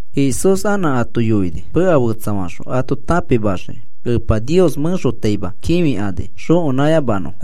Jesús anã ato yoini meka fetsafaxõ ato tãpimaxiki, Epa Nios mẽxotaima kĩfikani xokenãyamanõfo.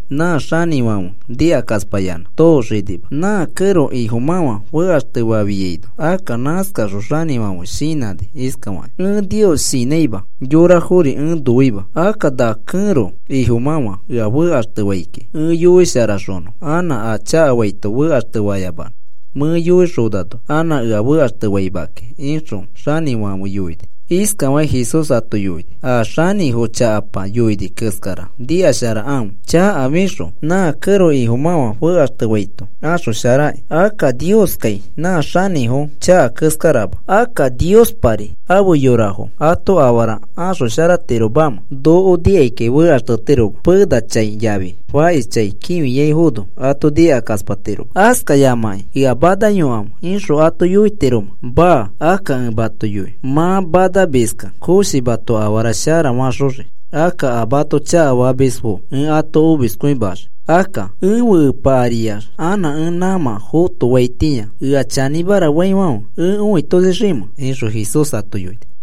nã xanĩfãfe nikakaspayanã tooxanima. Nã kẽro ifomafa fekaxtefafiaino akka nãskaxõ xanĩfãfe shinãni iskakĩ: ‘Ẽ Nios shinãima, yorafori ẽ noima. Akka na kẽro ifomãfa ea fekaxtefai kiki, ẽ yoisharaxonõ anã a chakafaito fekaxtefayamanõ, mẽ yoixonano anã ea fekaxtefaima kiki,’ ixõ xanĩfãfe yoini.” Iskafakĩ Jesús ato yoini: “A xanĩfo chakapa yoini keskara nikasharakãfe. Chakafixõ nã kẽro ifomafa fekaxtefaito axosharaniki. Akka Nioskai nã xanĩfo chaka keskarama. Akka, ¿Niospari ãfe yorafo ato afara axosharatiromamẽ? Noko nikaikai fekaxtetiroma penachãi yafi fakishchãi kĩfiaifono ato nikakaspatiroma. ¿Askayamakĩ, ‘Ea manayokãfe,’ ixõ ato yoitiromẽ? Maa. Akka ẽ mato yoi mã manamiskẽ koshi mato afara shara faxoxii. Akka a mato chakafamisfo ẽ ato omiskõimaxii. Akka, ¿ẽfe Epa ariax anã ẽ nãmã fotoaitĩa ea chanĩmara faifãfe ẽ õitoshiximẽ?” ixõ Jesús ato yoini.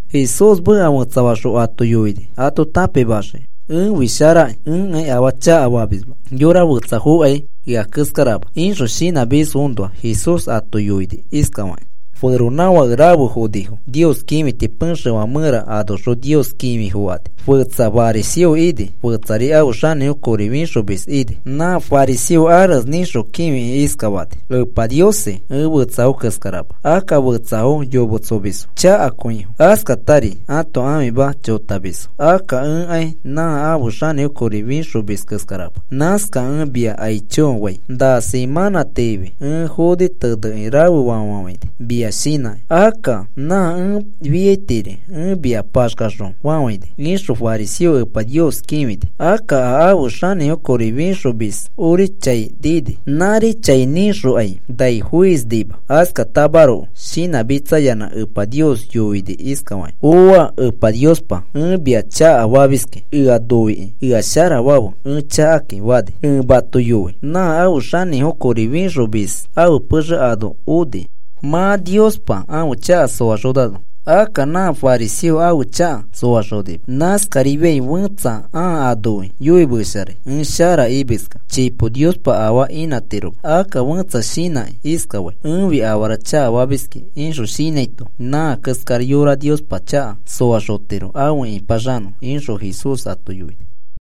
Jesús meka fetsafaxõ ato yoini ato tãpimaxiki. “Ẽfi sharaki, ẽkai afaa chakafamisma yora fetsafokai ea keskarama,” ixõ shinãmisfoõnoa Jesús ato yoini iskafakĩ: “Feronãfake rafe fonifo Nios kĩfiti pexefã mẽra anoxõ Nios kĩfi fokani. Fetsa fariseo ini. Fetsari ãfe xanĩfo kori fixomis ini. Nã fariseo arese nĩxõ kĩfikĩ iskafani: ‘Epa Niosi, ẽ fetsafo keskarama. Akka fetsafo yometsomisfo, chakakõifo, askatari ato ãfima chotamisfo. Akka ẽkai nã ãfe xanĩfo kori fĩxomis keskarama. Nãskakẽ ẽ mia aicho fai. Na semãnã tiifi ẽ foni tenekĩ rafefa fafafãini mia shinãkĩ. Akka nã ẽ fiairi ẽ mia paxkaxõ fafãini,’ ixõ fariseo Epa Nios kĩfini. Akka a ãfe xanĩfo kori fĩxomis ori chai nini. Nãri chai nĩxokai nai foispainima. Askatamaroko shinãmitsayanã Epa Nios yoini iskafakĩ: ‘¡Ooa! Epa Niospa, ẽ mia chakafamiski. Eõ noikĩ ea sharafafe ẽ chakakĩ,’ fani. Ẽ mato yoi nã ãfe xanĩfo kori fixomis ãfe pexe ano oni mã Niospa ãfe chaka soaxonano. Akka nã fariseo ãfe chaka soaxonima. Nãskarifiai fetsa ãa anoi yoimesharai: ‘Ẽ sharara,’ imiskẽ chipo Niospa afaa imatiroma. Akka fẽtsa shinãkĩ iskafai: ‘Ẽfi afarafo chakafamiski,’ ixõ shinãito nã keskara yora Niospa chaka soaxotiro afe ĩpaxanõ,” ixõ Jesús ato yoini.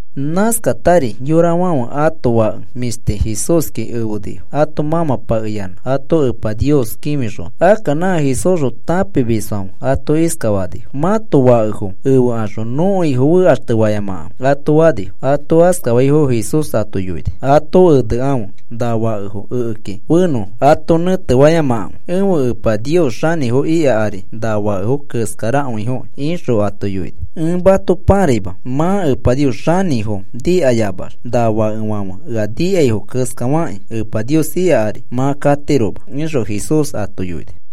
Nãskatari yorafãfe ato fake mĩshti Jesúski efenifo ato mãmãpakeyanã ato Epa Nios kĩfixonõ. Akka nã Jesúsxõ tãpimisfãfe ato iskafanifo: “Mãto fakefo efexõ nõko Ifo fekaxtefayamakãfe,” ato fanifo. Ato askafaifono Jesús ato yoini: “Ato enekãfe na fakefo ekeki fenõfo. Ato nẽtefayamakãfe. Ẽfe Epa Nios xanĩfo ika ari na fakefo keskarakõifoki,” ixõ ato yoini. “Ẽ mato pãraima, mã Epa Nios xanĩfo nikayamax na fakefãfe ea nikaifo keskafakĩ, Epa Nios ika ari mã katiroma,” ixõ Jesús ato yoini.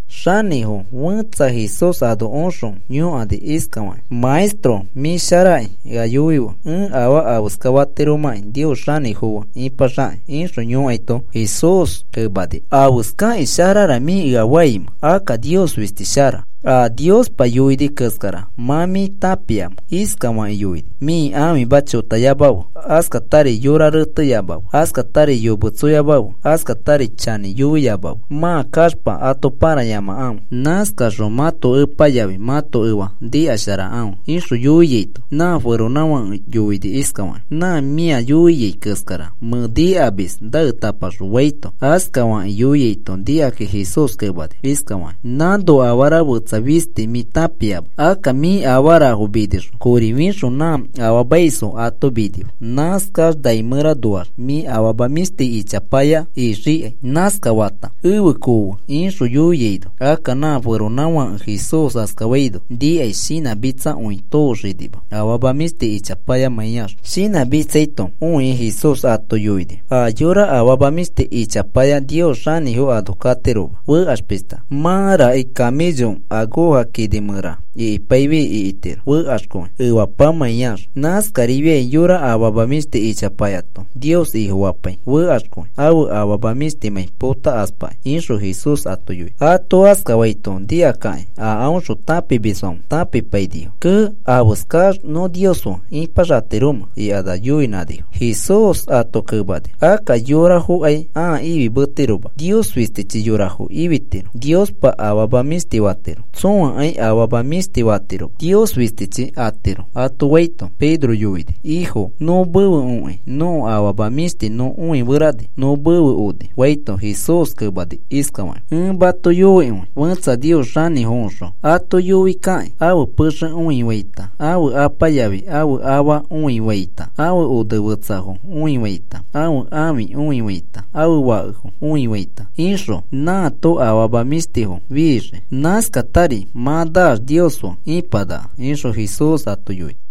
Xanĩfo fetsa Jesús ano oxõ yõkani iskafakĩ: “Maestro, mĩ sharaki, ea yoife ẽ afaa afeska fatiromãki Nios xanĩfo fe ipaxaki,” ixõ yõkaito, Jesús kemani: “¿Afeskakĩ sharara mĩ ea faimẽ? Akka Nios fisti shara. A Niospa yoini keskara mã mĩ tãpia. Iskafakĩ yoini: ‘Mĩ ãfima chotayamafe; askatari yora reteyamafe; askatari yometsoyamafe; askatari chanĩyamafe mã kaxpa ato pãrayamakãfe. Nãskaxõ mãto epa yafi mãto efa nikasharakãfe,’” ixõ yoiaito, nã feronãfake yoini iskafakĩ: “Nã mĩa yoiaifo keskara mẽ nikamis naetapaxõ,” faito, askafakĩ yoiaito nikakĩ Jesús kemani iskafakĩ: “Nãno afara fetsa fisti mĩ tãpiama. Akka mĩ afarafo minixõ kori fixõ nã afaamaisfo ato minife. Nãskax nai mẽranoax mĩ afama mĩshtifoya ixikai. Nãskafata efe koofe,” ixõ yoiaino, akka nã feronãfake Jesús askafaito nikai, shinãchakakõi tooxinima, afama mĩshti ichapayax. Shinãmitsaito õikĩ Jesús ato yoini: “A yora afama mĩshti ichapaya Nios xanĩfo ano katiroma, fekax pishta. Mãraki camello akoja kini mẽra ikipaifi ikitiro fekaxkõi efapamãiax. Nãskarari yora afama mĩshti ichapayato Nios Ifofapai fekaxkõi ãfe afama mĩshtifomãi potakaspakĩ,” ixõ Jesús ato yoini. Ato askafaito nikakakĩ a aõxõ tãpimisfãfe tãpipainifo. “¡Kee! ¿Afeskax nõ Nios fe ipaxatiromẽ?” ikanax yoinãnifo. Jesús ato kemani: “Akka yorafokai ãa ifimetiroma, Nios fistichi yorafo ifitiro. Niospa afama mĩshti fatiro. Tsõakai afama mĩshti fatiroma, Nios fistichi atiro,” ato faito, Pedro yoini: “Ifo, nõ mefe okĩ nõko afama mĩshtifo nõ õiferani nõ mefe oni,” faito, Jesús kemani iskafakĩ: “Ẽ mato yoikõi, fẽtsa Nios xanĩfoõxõ ato yoikakĩ ãfe pexe õifaita ãfe apa yafi ãfe afa õifaita ãfe onefetsafo õifaita ãfe ãfi õifaita ãfe fakefo õifaita ixõ, nãato afama mĩshtifo fixii. Nãskatari mã naax Nios fe ipanaka,” ixõ Jesús ato yoini.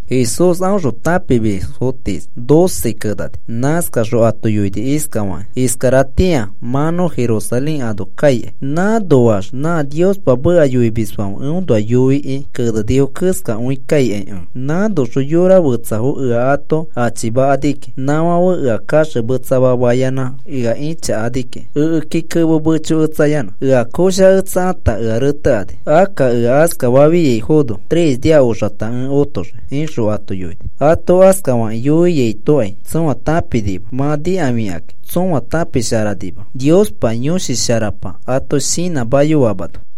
Jesús aõxõ tãpimis tiis doce kenani. Nãskaxõ ato yoini iskafakĩ: “Iskaratĩa mã nõ Jerusalén ano kaikai. Nãnoax nã Niospa meka yoimisfãfe eõnoa yoikĩ kenenifo keskakõi kaikai ẽ. Nãnoxõ yora fetsafo ea ato achimakani kiki. Nãfãfe ea kaxemetsama fayanã ea ĩchakani kiki ekeki kemo mechoketsayanã. Ea koshaketsakata ea retekani. Akka ea askafafiaifono tres nia oxata ẽ otoxii,” ixõ ato yoini. Ato askafakĩ yoiaitokai tsõa tãpinima. Mã nikafikakĩ tsõa tãpisharanima, Niospa Yõshi Sharapa ato shinãmayoamano.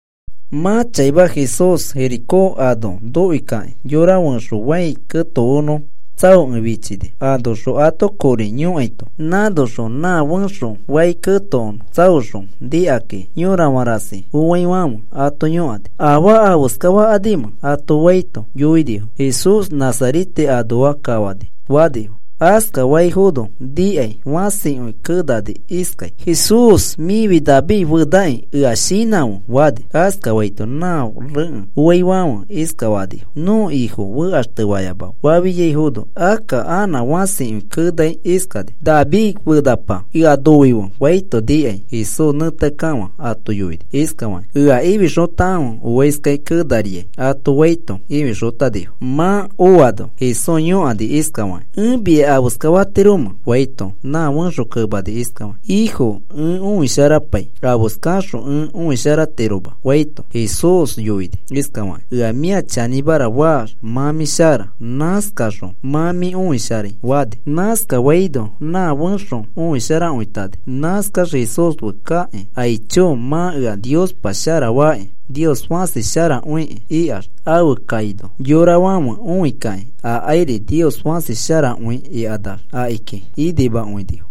Mã chaima Jesús Jericó ano nokoi kakĩ, yora fẽxo fai ketokonõ tsaokẽ fichini, anoxõ ato kori yõkaito. Nãnoxõ nã fẽxo fai ketokonõ tsaoxõ nikakĩ yorafã rasi fofãnaifãfe ato yõkani: “¿Afaa afeskafakanimẽ?” ato faito, yoinifo: “Jesús Nazarete anoa kafani,” fanifo. Askafaifono nikai fãsikõi kenani iskai: “Jesús mĩfi David fenakĩ, ea shinãfe,” fani. Askafaito nã rekẽ foaifãfe iskafanifo: “Nõko Ifo fekaxtefayamafe,” fafiaifono, akka nã fãsikõi kenai iskani: “¡David fenapa, eõ noife!” faito nikai, Jesús nẽteakekafã ato yoini iskafakĩ: “Ea ifixotakãfe oaiskai kenariai,” ato faito ifixotanifo. Mã oano Jesús yõkani iskafakĩ: “¿Ẽ mia afeskafatiromẽ?” faito, nã fẽxo kemani iskafaki: “Ifo, ẽ oĩsharapai afeskaxõ ẽ õisharatiroma,” faito, Jesús yoini iskafaki: “Ea mĩa chanĩmara faax mã mĩ shara. Nãskaxõ mã mĩ õisharai,” fani. Nãskafaino nã fẽxo õisharakõitani. Nãskax Jesús fe kakĩ, “Aicho mã ea Niospa sharafaki, Nios fãsi sharakõikĩ,” ikax afe kaino yorafãfe õikakĩ akairi, “Nios fãsi sharakõi,” ikanax akiki inimakõinifo.